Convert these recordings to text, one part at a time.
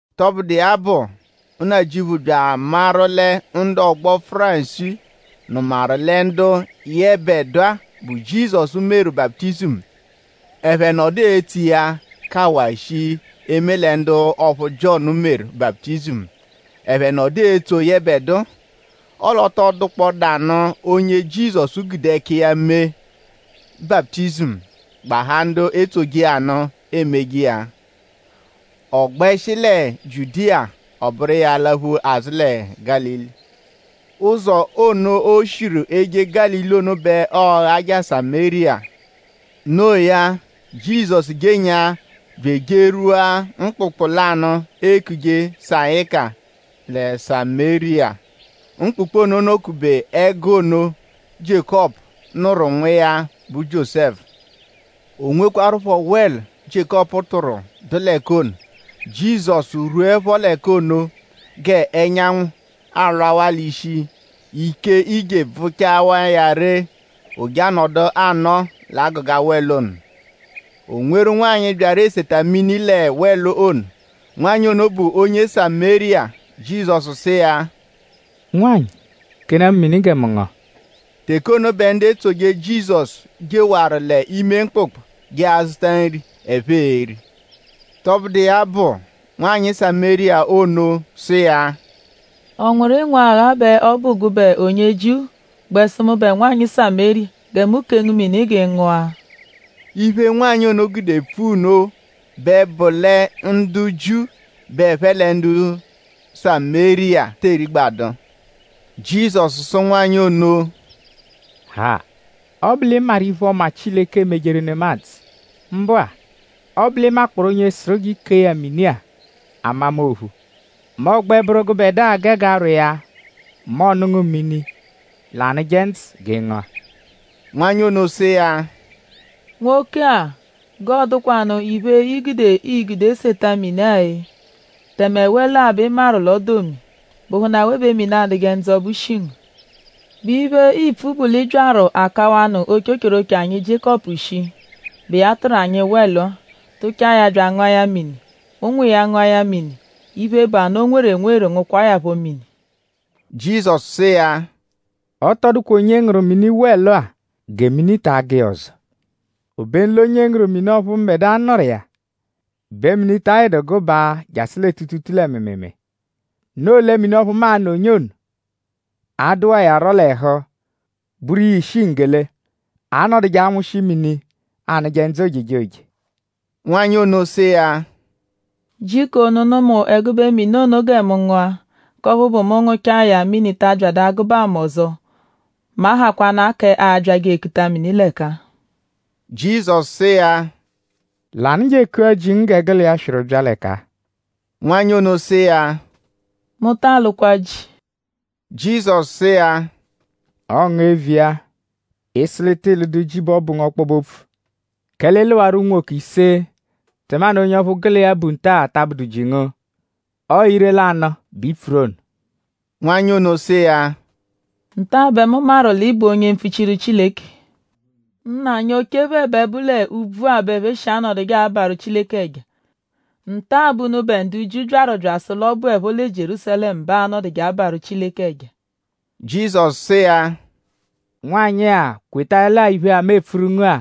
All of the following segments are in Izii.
Tọbudu iya bụ; Nnajịuphu bya amaru lẹ ndu ọgbo Fárisii nụmawaru lẹ ndu yẹbedua, bụ Jizọsu meru baputizimu; ẹphe nọdu etso iya kawaa shii eme lẹ ndu ọphu Jiọnu meru baputizimu; ẹphe nọdu etso yẹbedua. Ọle ọ tọ dụkpodaanu onye Jizọsu gude ẹka iya mee baputizimu; gbahaa ndu etsoje iya nụ emeje iya. Ọ gbẹshi lẹ Jiudiya; ọ bụru iya alaphu azụ lẹ Gálili. Ụzo ono, o shiru eje Gálili ono bẹ ọo-ghaja Samériya. No iya; Jizọsu jenyaa bya ejerwua mkpụkpu lanụ, eekuje Sayika lẹ Samériya. Mkpụkpu ono nọ-kube ẹgu ono, Jiékọpu nụru nwa iya, bụ Jiósẹfu. O nwekwarụpho wẹlu, Jiékọpu tụru, dụ l'ẹka ono. Jizọsu rwuẹpho l'ẹka ono g'ẹnyanwu alwawaa l'ishi; ike ije bvụchawa iya ree. Ọ je anọdu anọo l'agụga wẹlu ono. O nweru nwanyị, byaru eseta mini lẹ wẹlu ono. Nwanyị ono bụ onye Samériya. Jizọsu sụ iya: “Nwanyị; kenaa mu mini gẹ mu ngụa.” Teke ono bẹ ndu etsoje Jizọsu jeshiwaru l'ime mkpụkpu je azụta nri, ẹphe e-ri. Tọbudu iya bụ; nwanyị Samériya ono sụ iya: “?Ọ nwụru ịnwu-agha bẹ ọ bụ gụbe onye Jiu gbẹ sụ mụbe nwanyị Samériya gẹ mu kee ngu mini g'ị ngụa?” Iphe, nwanyị ono gude pfua nno bẹ bụ lẹ ndu Jiu bẹ ẹphe lẹ ndu Samériya te erigbadu. Jizọsu sụ nwanyị ono: “Ha! Ọ -bụ l'ị maru iphe-ọma, Chileke emejeru nemadzụ; mbụ-a; ọ -bụ l'ị makpọoru onye sụru g'i kee ya mini-a amama ophu mẹ ọ gbẹ bụru gụbedua gege arwọ iya mẹ ọ nụ ngu mini, l'anụje ndzụ g'ị ngụa.” Nwanyị ono sụ iya: “Nwoke-a!?G'ọodukwanu iphe, i gude, ii-gude seta mini-a-e? Tẹme wẹlu-a bẹ ị maru l'ọ dụ omi.?Bụhunu awe bẹ mini, anụje ndzụ ọbu shi ngu? ?Bụ iphe, iipfu bụ l'ị byaru akawanụ ochochoroche anyi Jiékọpu shii, bụ iya tụru anyi wẹlu-a; tụchaa ya bya angụa ya mini; ụnwu iya ngụa ya mini; iphe, bụ anụ, o nweru enweru ngụkwaa ya phọ mini?” Jizọsu sụ iya: “Ọ tọ dụkwa onye ngụru mini wẹlu-a gẹ mini ta agụ iya ọzo. Obenu l'onye ngụru mini ọphu mbẹdua nụru iya bẹ mini ta ayịdu gụbaa jasụ lẹ tuutuutuu lẹ mịimiimii. Noo lẹ mini ọphu mu a-nụ onye ono a-dụwa iya rọ l'ẹhu bụru iya ishi nggele, a-nọduje anwụshi mini, anụje ndzụ ojejoje.” Nwanyị ono sụ iya: “Jiko nụnu mu ẹgube mini ono gẹ mu ngụa; k'ọphu bụ: mu -ngụchaa ya; mini ta abyadụ agụbaa mu ọzo; mu ahakwanaa k'abyajẹ ekuta mini l'ẹka-a.” Jizọsu sụ iya: “Lànụ je ekua ji ngu gẹ gụ l'iya swịru bya l'ẹka-a.” Nwanyị ono sụ iya: “Mu ta alụkwa ji.” Jizọsu sụ iya: “Ọo ngu eviya. Ị -sụ l'ị tịi lụdu ji bẹ ọ bụ ngu ọkpobe-opfu. Kẹle ị lụwaru unwoke ise; tẹmanu onye ọphu gụ l'iya bu nta-a ta abụdu ji ngu. Ọo ire-lanụ bẹ i pfuru ono.” Nwanyị ono sụ iya: “Nta-a bẹ mu maru l'ị bụ onye mpfuchiru Chileke. Nna anyi oche phẹ bẹ bụ l'úbvú-a bẹ ẹphe shi anọduje abarụ Chileke ẹja. Nta-a bẹ unubẹ ndu Jiu byaru bya asụ l'ọ bụepho lẹ Jierúsalẹmu bẹ aanọduje abarụ Chileke ẹja.” Jizọsu sụ iya: “Nwanyị-a; kwetaẹle-a iphe-a, mu epfuru ngu-a;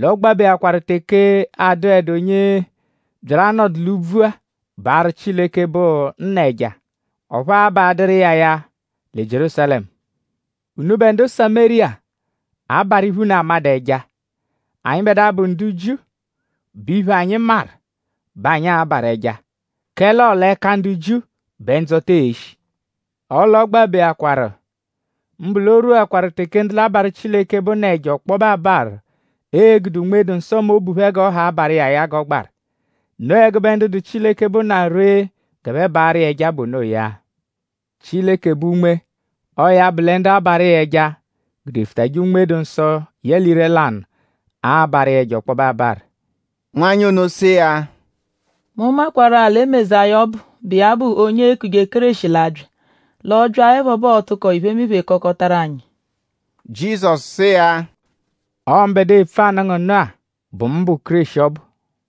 l'ọogbabeakwa teke adụedu onye byaru anọdu l'úbvú-a baarụ Chileke, bụ Nna ẹja; ọphu aabadụru iya ya lẹ Jierúsalẹmu. Unubẹ ndu Samériya abarụ iphe, unu amadụ ẹja; anyịbedua, bụ ndu Jiu bụ iphe, anyi maru bẹ anyi abarụ ẹja; kẹle ọo l'ẹka ndu Jiu bẹ ndzọta e-shi. Ọle ọogbabeakwa; mbụ l'o rwuakwaru teke ndu l'abarụ Chileke, bụ Nna ẹja ọkpobe abarụ e-gude Unme-dụ-Nsọ mẹ obu phẹ g'ọ ha abarụ iya ya g'ọ gbarụ. Noo ẹgube ndu dụ Chileke, bụ Nna ree g'ẹphe barụ iya ẹja bụ onoya. Chileke bụ Unme. Ọo ya bụ lẹ ndu abarụ iya ẹja gudefụtaje Unme-dụ-Nsọ yẹle ire-lanụ abarụ iya ẹja ọkpobe abarụ.” Nwanyị ono sụ iya: “Mu makwarụ-a lẹ Mezaya ọbu, bụ iya bụ onye eekuje Kéreshi l'a-bya. L'ọ -byaẹpho bẹ ọo-tụko iphemiphe kọkotaru anyi.” Jizọsu sụ iya: “Ọo mbẹdua, epfu anụ ngu nụ-a bụ mu bụ Kéreshi ọbu.”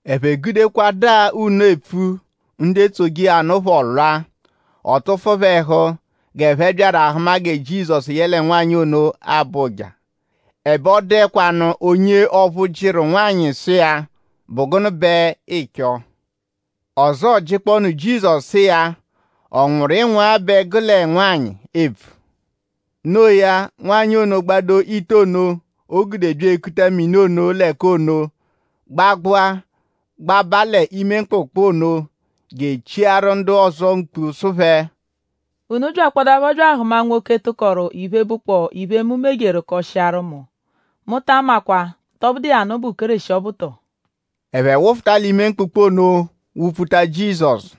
Ẹphe gudekwadaa nno epfu; ndu etsoje iya nụ phọ lwa. Ọ tụfu phẹ ẹhu g'ẹphe byaru ahụma gẹ Jizọsu yẹle nwanyị abọ ụja. Ẹbe ọ dụekwanu onye ọphu jịru nwanyị sụ iya: “?Bụ gụnu bẹ ịicho?” Ọzoo jịkpoonu Jizọsu sụ iya: “?Ọ nwụru ịnwuagha bẹ gụ lẹ nwanyị epfu?” Noo ya; nwanyị ono gbado ite ono, o gude bya ekuta mini ono l'ẹka ono; gbagbụa gbaba l'ime mkpụkpu ono je echiaru ndu ọzo mkpu sụ phẹ: “Unu byakpọdapho bya ahụma nwoke, tụkoru iphe, bụkpoo iphe, mu mejeru kọshiaru mu. Mu ta amakwa?tọ bụdu iya nụ bụ Kéreshi ọbu tọo?” Ẹphe wụfuta l'ime mkpụkpu ono wụ-pfuta Jizọsu.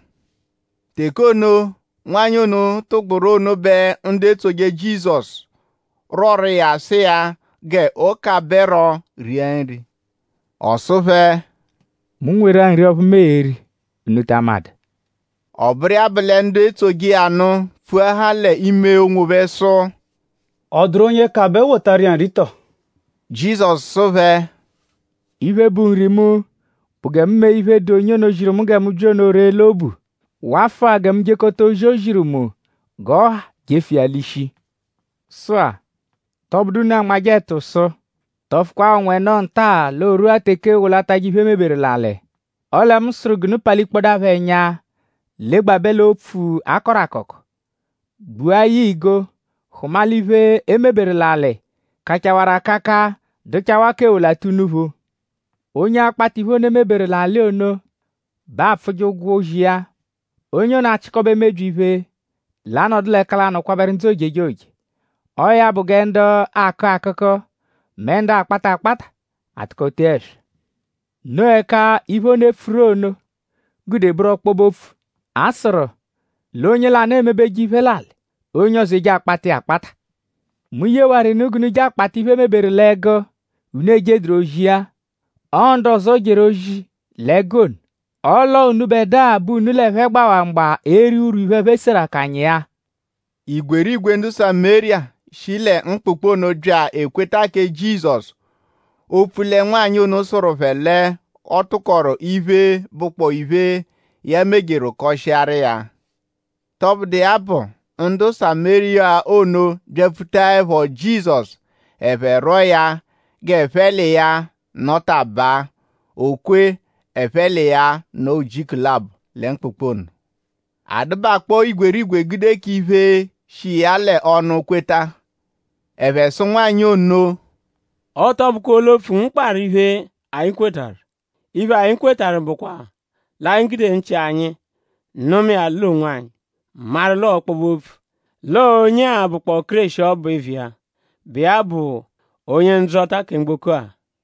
Teke ono, nwanyị ono tụgburu ono bẹ ndu etsoje Jizọsu rwọru iya sụ iya g'ọ kabẹro ria nri. Ọ sụ phẹ: “Mu nweru-a nri ọphu mu e-ri, unu ta amadụ.” Ọ bụru iya bụ lẹ ndu etsoje iya nụ pfuahaa l'ime onwophẹ sụ: “?Ọ dụru onye kabẹ wotawaru iya nri tọo?” Jizọsu sụ phẹ: “Iphe, bụ nri mu bụ gẹ mu mee iphe, dụ onye ono, ziru mu gẹ mu bya ono ree l'obu; wafụa gẹ mu jekọta ozi, o ziru mu g'ọ ha jefu iya l'ishi. Sụ-a;?tọ bụdu unu anmajẹ ẹtu sụ: ‘Tọfukwaa ọnwa ẹno nta-a l'o rwua teke eewolatajẹ iphe, e meberu l'alị.’ Ọle mu sụru g'unu palikpọdapho ẹnya legbabẹ l'opfu, a kọru akọko; gbua ya igo hụma l'iphe, e meberu l'alị kachawarụ akaka dụchawaa k'ewolata unuphu! Onye akpata iphe ono, e meberu l'alị ono bẹ aapfụje ụgwo ozi iya. Onye ono achịkobe mebyi iphe, l'a-nọdu l'ẹka lanụ kwabẹru ndzụ ojejoje. Ọo ya bụ gẹ ndu akụ akụku; mẹ ndu akpata akpata atụko tee ẹswa. Noo ẹka iphe ono, e pfuru ono gude bụru ọkpobe-opfu; a sụru: ‘L'onye lanụ emebeje iphe l'alị; onye ọzo eje akpata iya akpata.’ Mu yewaru unu g'unu je akpata iphe, e meberu l'ẹgu, unu ejeduru ozi iya. Ọo ndu ọzo jeru ozi l'ẹgu ono; ọ l'ọo unubẹdua bẹ unu l'ẹphe gbawaa mgba eri urwu iphe, ẹphe seru akanya iya.” Igwerigwe ndu Samériya, shi lẹ mkpụkpu ono bya ekweta kẹ Jizọsu; opfu lẹ nwanyị ono sụru phẹ l'ọ tụkoru iphe, bụkpoo iphe, ya mejeru kọshiaru iya. Tọbudu iya bụ; ndu Samériya ono byapfutaẹpho Jizọsu; ẹphe rwọo ya g'ẹphe l'iya nọtabaa. O kwe; ẹphe l'iya nọo ujiku labọ lẹ mkpụkpu ono. A dụbakpoo igwerigwe gude k'iphe shi iya l'ọnu kweta. Ẹphe sụ nwanyị ono: “Ọ tọ bụkwaa olu-opfu ngu kparụ iphe, anyi kwetarụ. Iphe, anyi kwetarụ bụkwa l'anyi gudewaa nchị anyi nụma iya l'onwanyi; maru l'ọo ọkpobe-opfu: l'ọo onye-a bụkpoo Kéreshi ọbu eviya, bụ iya bụ Onye-Ndzọta kẹ mgboko-a.”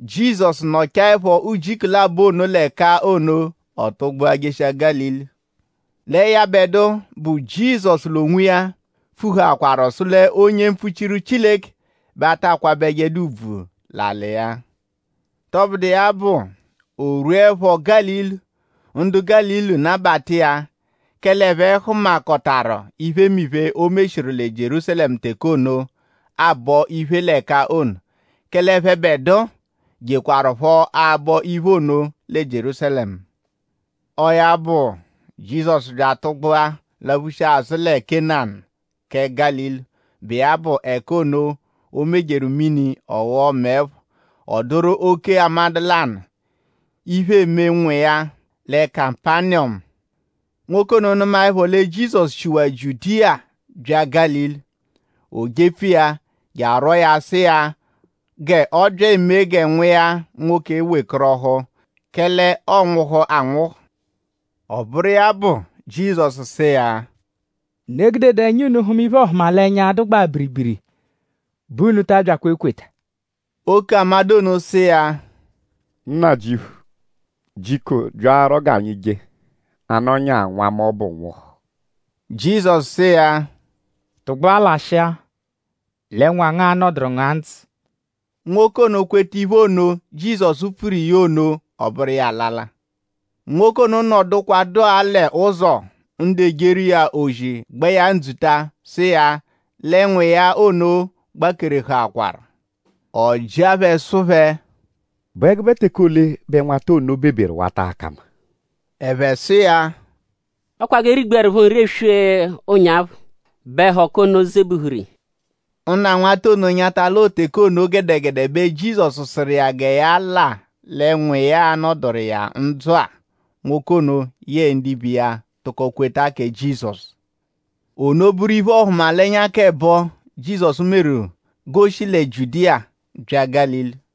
Jizọsu nọchaepho ujiku labọ ono l'ẹka ono; ọ tụgbua jeshia Gálili. Lẹ yẹbedua, bụ Jizọsu l'onwiya pfuhaakwaru sụ l'onye mpfuchiru Chileke bẹ a ta kwabẹjedu ùbvù l'alị iya. Tọbudu iya bụ; o rwuẹpho Gálili; ndu Gálili nabata iya; kẹle ẹphe hụmakotaru iphemiphe, o meshiru lẹ Jierúsalẹmu teke ono, aabọ iphe l'ẹka ono; kẹle ẹphebedua jekwarụpho abọ iphe ono lẹ Jierúsalẹmu. Ọo ya bụ; Jizọsu bya atụgbua laphushia azụ lẹ Kena kẹ Gálili, bụ iya bụ ẹka ono, o mejeru mini ọ ghọo mẹe phọ. Ọ dụru oke-amadụ lanụ, iphe eme nwa iya lẹ Kapaniyọmu. Nwoke ono nụmaepho lẹ Jizọsu shiwaa Jiudiya bya Gálili; o jepfu iya je arwọo ya sụ iya g'ọ bya emee gẹ nwa iya nwoke wekọrohu; kẹle ọonwuhu anwụhu. Ọ bụru iya bụ; Jizọsu sụ iya: “Unu egudedu ẹnya unu hụma iphe-ọhumalenya, dụgbaa biribiri bẹ unu ta abyakwa ekweta.” Oke-amadụ ono sụ iya: “Nnajịuphu; jiko byarọ g'anyi je; a -nọnyaa nwa mu ọbu nwụhu.” Jizọsu sụ iya: “Tụgbua lashịa; lẹ nwa ngu a-nọduru ngu-a ndzụ.” Nwoke ono kweta iphe ono, Jizọsu pfuru iya ono; ọ bụru iya alala. Nwoke ono nọdukwadua l'ụzo; ndu ejeru iya ozi gba iya ndzuta; sụ iya lẹ nwa iya ono gbakerehụakwaru. Ọ jịa phẹ sụ phẹ: “?Bụ ẹgube teke ole bẹ nwata ono beberu wata aka mma?” Ẹphe sụ iya: “Ọ kwa g'e rigbuẹrupho nri eswe ụnyaphu bẹ ẹhoku ono zebuhuru iya.” Nna nwata ono nyata l'ọo teke ono gẹdegede bẹ Jizọsu sụru iya gẹ ya la lẹ nwa iya a-nọduru iya-a ndzụ-a. Nwoke ono yẹe ndibe iya tụko kweta kẹ Jizọsu. Ono bụru iphe-ọhumalenya k'ẹbo, Jizọsu meru g'o shi lẹ Jiudiya bya Gálili.